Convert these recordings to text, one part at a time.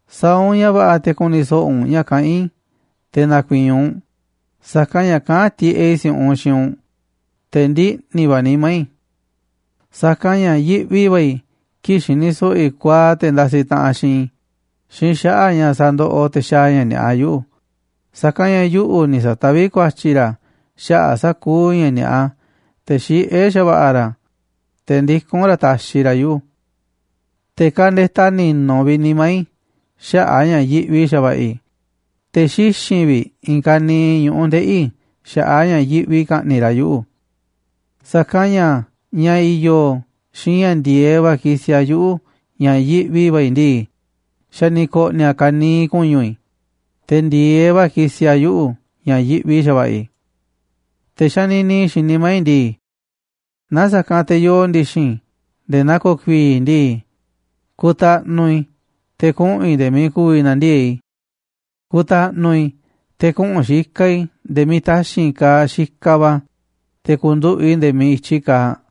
Sa̱a̱ u̱nꞌ ña̱ va̱ꞌa̱ te̱ ku̱ni̱ so̱ꞌo̱ u̱nꞌ ña̱ kaꞌán i̱ te̱ na̱ku̱i̱i̱n u̱nꞌ, sa̱kanꞌ ña̱ kaꞌán tiꞌeꞌ i̱ si̱u̱ꞌunꞌ xiinꞌ u̱nꞌ, te̱ ndiꞌni̱ va̱ nimá i̱. Sa̱kanꞌ ña̱ yiꞌvi va̱ i̱ kii̱ꞌ xini so̱ꞌo̱ i̱ kuaaꞌ te̱ ndasiꞌ taꞌanꞌ xiinꞌ i̱ xiinꞌ xaꞌa̱ꞌ ña̱ sandoꞌoꞌ te̱ xaaꞌ ña̱ ni̱a̱ꞌa yuꞌu̱, sa̱kanꞌ ña̱ yuꞌu̱ ni̱ sa̱taví ku̱a̱tyi̱ ra̱ xaꞌa̱ꞌ sa̱kuuꞌ ña̱ ni̱a̱ꞌa, te̱ xiꞌé xa̱va̱ꞌa̱ ra̱, te̱ ndikún ra̱ taxiꞌ ra̱ yuꞌu̱. Te̱ kandetaꞌ ni̱nu̱ vi̱ꞌ nimá i̱ xaꞌa̱ꞌ a̱ ña̱ yiꞌvi xa̱va̱ꞌa̱ i̱, te̱ xixi̱n vi̱ꞌ i̱i̱n ka̱niiꞌ ñu̱ꞌuꞌ ndeꞌi̱ i̱ xaꞌa̱ꞌ a̱ ña̱ yiꞌvi i̱ ka̱ꞌni̱ꞌ ra̱ yuꞌu̱. Sa̱kanꞌ ña̱ ña̱ i̱yo̱ xiinꞌ ña̱ ndi̱e̱eꞌ va̱ kisiꞌ a̱ yuꞌu̱ ña̱ yivi̱ꞌ va̱ i̱ ndii, xa̱ ni̱ ko̱ꞌni̱ a̱ i̱i̱n ka̱niiꞌ ku̱ñu̱ i̱, te̱ ndi̱e̱eꞌ va̱ kisiꞌ a̱ yuꞌu̱ ña̱ yiꞌvi xa̱va̱ꞌa̱ i̱. Te̱ xanini i̱ xiinꞌ nimá i̱ ndii: “Naaꞌ sa̱kanꞌ te̱ yoo ndi̱xi̱n i̱ nde̱e̱ naa ko̱ku̱i̱i̱ ndii, ku̱ta̱ꞌnu̱ i̱ te̱ kuꞌu̱n i̱ nde̱e̱ miiꞌ ku̱vi̱ na̱ndiee̱ꞌ i̱. Ku̱ta̱ꞌnu̱ i̱ te̱ kuꞌu̱n xikaꞌ i̱ nde̱e̱ miiꞌ taxi̱nꞌ kaaꞌ xikaꞌ va̱, te̱ ku̱nduꞌu̱ꞌ i̱ nde̱e̱ miiꞌ i̱tyi kaaꞌ.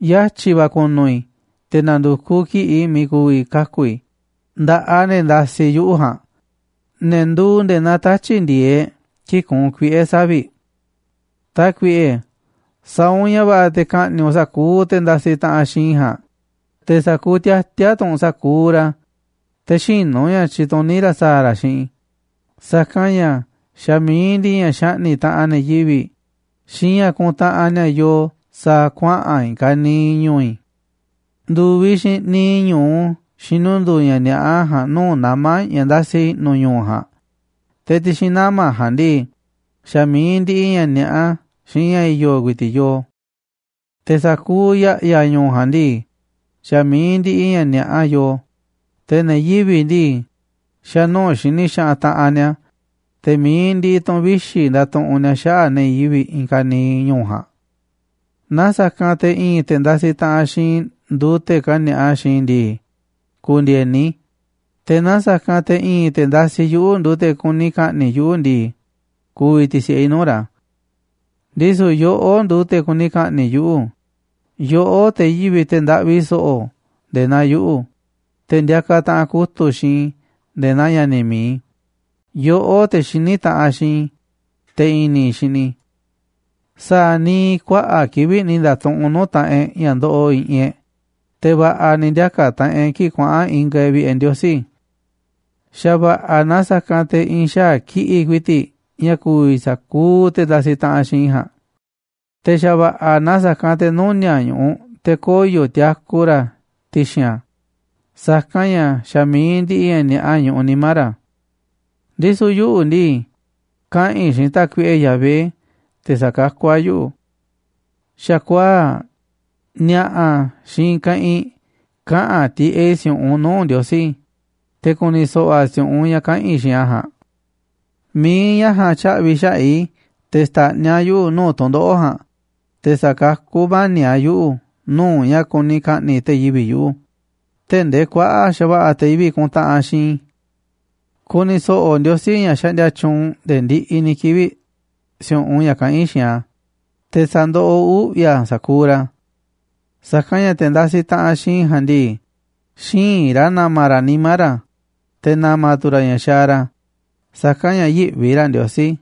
Yatyi̱ va̱ ku̱nu̱ i̱ te̱ na̱ndu̱kuꞌ kiꞌi̱ꞌ i̱ miiꞌ ku̱vi̱ kaku̱ i̱ nda̱ꞌaꞌ ne̱ ndasiꞌ yuꞌu̱ ja̱a̱nꞌ, ne̱ nduuꞌ nde̱e̱ naa tatyi̱ꞌ ndi̱e̱eꞌ kii̱ꞌ kuunꞌ kuiꞌe̱ savi̱ꞌ.” Tákuiꞌe, sa̱a̱ u̱nꞌ ña̱ va̱ꞌa̱ te̱ ka̱ꞌni̱ꞌ u̱nꞌ sa̱kuuꞌ te̱ ndasiꞌ taꞌanꞌ xiinꞌ i̱ ja̱a̱nꞌ, te̱ sa̱a̱ ku̱u̱ tiati̱a̱ tu̱ u̱nꞌ sa̱kuuꞌ ra̱ te̱ xïnu̱ ña̱ tyituní ra̱ sa̱a̱ ra̱ xiinꞌ i̱, sa̱kanꞌ ña̱ xa̱ mi̱iꞌ ndiꞌiꞌ ña̱ xaꞌni̱ꞌ taꞌanꞌ ne̱ yivi̱ꞌ xiinꞌ ña̱ kuntaꞌanꞌ ni̱a̱ yoo sa̱a̱ kuaꞌa̱n i̱i̱n ka̱niiꞌ ñu̱u̱ i̱. Ndu̱viꞌ xiinꞌ niiꞌ ñu̱u xinundu̱u̱ ña̱ ni̱a̱ꞌa ja̱a̱nꞌ nuu̱ꞌ nama̱ ña̱ ndasi i̱ꞌnu̱ ñu̱u̱ ja̱a̱nꞌ, te̱ ti̱xi̱n nama̱ ja̱a̱nꞌ ndii, xa̱ mi̱iꞌ ndiꞌiꞌ ña̱ ni̱a̱ꞌa xiinꞌ ña̱ i̱yo̱ ku̱i̱ti̱ꞌ yoo. Te̱ sa̱kuuꞌ ya̱ꞌya̱ ñu̱u̱ ja̱a̱nꞌ ndii, xa̱ mi̱iꞌ ndiꞌiꞌ ña̱ ni̱a̱ꞌa yoo, te̱ ne̱ yivi̱ꞌ ndii, xa̱ nuu̱ꞌ xini xaꞌanꞌ taꞌanꞌ ni̱a̱, te̱ mi̱iꞌ ndiꞌiꞌ tu̱n vixi̱ ndatuꞌunꞌ ni̱a̱ xaꞌa̱ꞌ ne̱ yivi̱ꞌ i̱i̱n ka̱niiꞌ ñu̱u̱ ja̱a̱nꞌ. Naaꞌ sa̱kanꞌ te̱ i̱i̱n te̱ ndasiꞌ taꞌanꞌ xiinꞌ i̱ nduuꞌ te̱ kani̱a̱ꞌa xiinꞌ i̱ ndii, ku̱ndi̱e̱ni i̱, te̱ naaꞌ sa̱kanꞌ te̱ i̱i̱n te̱ ndasiꞌ yuꞌu̱ nduuꞌ te̱ kuni ka̱ꞌni̱ꞌ yuꞌu̱ ndii, ku̱vi̱ ti̱si̱ꞌe i̱ nuu̱ꞌ ra̱. Ndisu̱ yoꞌó nduuꞌ te̱ kuni ka̱ꞌni̱ꞌ yuꞌu̱, yoꞌó, te̱ yivi̱ꞌ, te̱ ndaꞌvi so̱ꞌo̱ nde̱e̱ naa yuꞌu̱, te̱ ndiakaꞌ taꞌanꞌ kutu̱ꞌ xiinꞌ i̱ nde̱e̱ naa ña̱ni̱ mi̱iꞌ i̱, yoꞌó, te̱ xiní taꞌanꞌ xiinꞌ i̱, te̱ i̱ni̱ i̱ xini i̱. Sa̱a̱ ni̱ kuaꞌa̱ꞌ kivi̱ꞌ ni̱ nda̱tuꞌunꞌ nuu̱ꞌ taꞌanꞌ e̱ꞌ ña̱ ndoꞌoꞌ i̱ꞌi̱n e̱ꞌ, te̱ va̱ꞌa̱ ni̱ ndiaka̱ taꞌanꞌ e̱ꞌ kii̱ꞌ kuaꞌa̱n ingaꞌ e̱ꞌ vi̱ꞌe̱ Ndiosí. Xa̱ va̱ꞌa̱ na sa̱kanꞌ te̱ i̱i̱n xaa̱ kiꞌi̱ꞌ ku̱i̱ti̱ꞌ ña̱ ku̱vi̱ sa̱kuuꞌ te̱ ndasiꞌ taꞌanꞌ xiinꞌ i̱ ja̱a̱nꞌ, te̱ xa̱va̱ꞌa̱ na sa̱kanꞌ te̱ nuni̱a̱ꞌ ñu̱ꞌuꞌ te̱ koyo̱ tiaku ra̱ ti̱xi̱n a̱, sa̱kanꞌ ña̱ xa̱ mi̱iꞌ ndiꞌiꞌ ña̱ ni̱a̱ꞌa ñuꞌuꞌ nimá ra̱. Ndisu̱ yuꞌu̱ ndii, kaꞌa̱n i̱ xiinꞌ Tákuiꞌe Yahvé te̱ sa̱kakú a̱ yuꞌu̱. Xa̱kuaa̱ꞌ, ni̱a̱ꞌa̱, xiinꞌ i̱i̱n keꞌinꞌ kaꞌa̱n tiꞌeꞌ i̱ si̱u̱ꞌunꞌ nuu̱ꞌ Ndiosí, te̱ ku̱ni̱ so̱ꞌo̱ a̱ si̱u̱ꞌunꞌ ña̱ kaꞌa̱n i̱ xiinꞌ a̱ ja̱a̱nꞌ. Mi̱iꞌ ña̱ ja̱a̱nꞌ tya̱ꞌvi̱ xaꞌa̱ꞌ i̱ te̱ xta̱ꞌniꞌ a̱ yuꞌu̱ nuu̱ꞌ tu̱ndoꞌo̱ꞌ ja̱a̱nꞌ, te̱ sa̱kakú mani̱ꞌ a̱ yuꞌu̱ nuu̱ꞌ ña̱ kuni ka̱ꞌni̱ꞌ te̱ yivi̱ꞌ yuꞌu̱, tee̱ꞌ ndee kuaꞌa̱ꞌ xa̱va̱ꞌa̱ te̱ yivi̱ꞌ kuntaꞌanꞌ xiinꞌ i̱. Ku̱ni̱ so̱ꞌo̱ Ndiosí, ña̱ xaꞌndia tyuunꞌ nde̱e̱ ndiꞌiꞌ ni̱ kivi̱ꞌ, si̱u̱ꞌunꞌ ña̱ kaꞌán i̱ xiinꞌ a̱, te̱ sa̱ndoꞌoꞌ uꞌvi̱ a̱ sa̱kuuꞌ ra̱. Sa̱kanꞌ ña̱ te̱ ndasiꞌ taꞌanꞌ xiinꞌ i̱ ja̱a̱nꞌ ndii, xïinꞌ ra̱ na̱ma̱ ra̱ nimá ra̱, te̱ na̱ma̱ tu̱ ra̱ ña̱ xaaꞌ ra̱, sa̱kanꞌ ña̱ yïꞌvi ra̱ Ndiosí.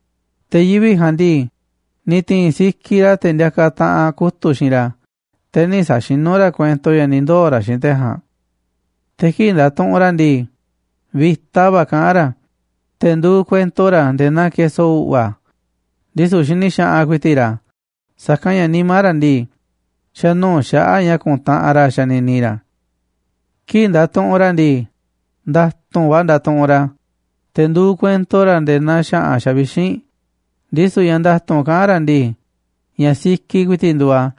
Te̱ yivi̱ꞌ ja̱a̱nꞌ ndii, ni̱ ti̱i̱n sikiꞌ ra̱ te̱ ndiakaꞌ taꞌanꞌ kutu̱ꞌ xiinꞌ ra̱, te̱ nï̱ sa̱xinú ra̱ kuento ña̱ ni̱ ndoo̱ ra̱ xiinꞌ te̱ ja̱a̱nꞌ. Te̱ kii̱ꞌ ndatuꞌunꞌ ra̱ ndii, vi̱ta va̱ kaꞌán ra̱, te̱ nduuꞌ kuento ra̱ nde̱e̱ naa keso u̱ꞌva̱, ndisu̱ xini xaꞌanꞌ ku̱i̱ti̱ꞌ ra̱, sa̱kanꞌ ña̱ nimá ra̱ ndii, xa̱ nuu̱ꞌ xaꞌa̱ꞌ ña̱ ku̱ntaꞌanꞌ ra̱ xanini ra̱. Kii̱ꞌ ndatuꞌunꞌ ra̱ ndii, nda̱tu̱nꞌ va̱ ndatuꞌunꞌ ra̱, te̱ nduuꞌ kuento ra̱ nde̱e̱ naa xa̱ꞌa̱n xavixínꞌ, ndisu̱ ña̱ nda̱tu̱nꞌ kaꞌán ra̱ ndii, ña̱ sikiꞌ ku̱i̱ti̱ꞌ nduuꞌ a̱,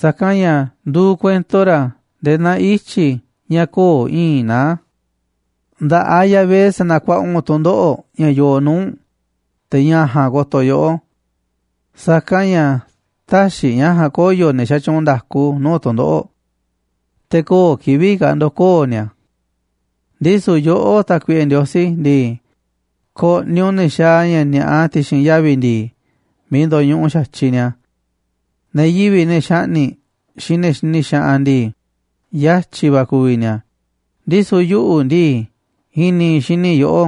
sa̱kanꞌ ña̱ nduuꞌ kuento ra̱ nde̱e̱ naa ityi̱ ña̱ köo̱ꞌ i̱i̱nꞌ naá. Nda̱ꞌaꞌ Yahvé sa̱na̱kuaꞌa u̱nꞌ tu̱ndoꞌo̱ꞌ ña̱ yoo nuu̱ꞌ u̱nꞌ, te̱ ña̱ ja̱a̱nꞌ ko̱to̱ yoꞌó. Sa̱kanꞌ ña̱ tä̱xi̱ ña̱ ja̱a̱nꞌ koyo̱ ne̱ xatyuunꞌ nda̱ku nuu̱ꞌ tu̱ndoꞌo̱ꞌ, te̱ köo̱ꞌ kivi̱ꞌ ka̱ ndo̱koo̱ ni̱a̱. Ndisu̱ yoꞌó, Tákuiꞌe Ndiosí ndii, ko̱ꞌni̱ u̱nꞌ ne̱ xaaꞌ ña̱ ni̱a̱ꞌa ti̱xi̱n yavi̱ ndi̱i̱ miiꞌ ndo̱ñuꞌuꞌ xa̱tyiꞌ ni̱a̱. Ne̱ yivi̱ꞌ, ne̱ xaꞌni̱ꞌ, xiinꞌ ne̱ xini xaꞌanꞌ ndii, yatyi̱ va̱ ku̱vi̱ ni̱a̱, ndisu̱ yuꞌu̱ ndii, i̱ni̱ i̱ xini i̱ yoꞌó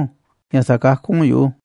ña̱ sa̱kakú u̱nꞌ yuꞌu̱.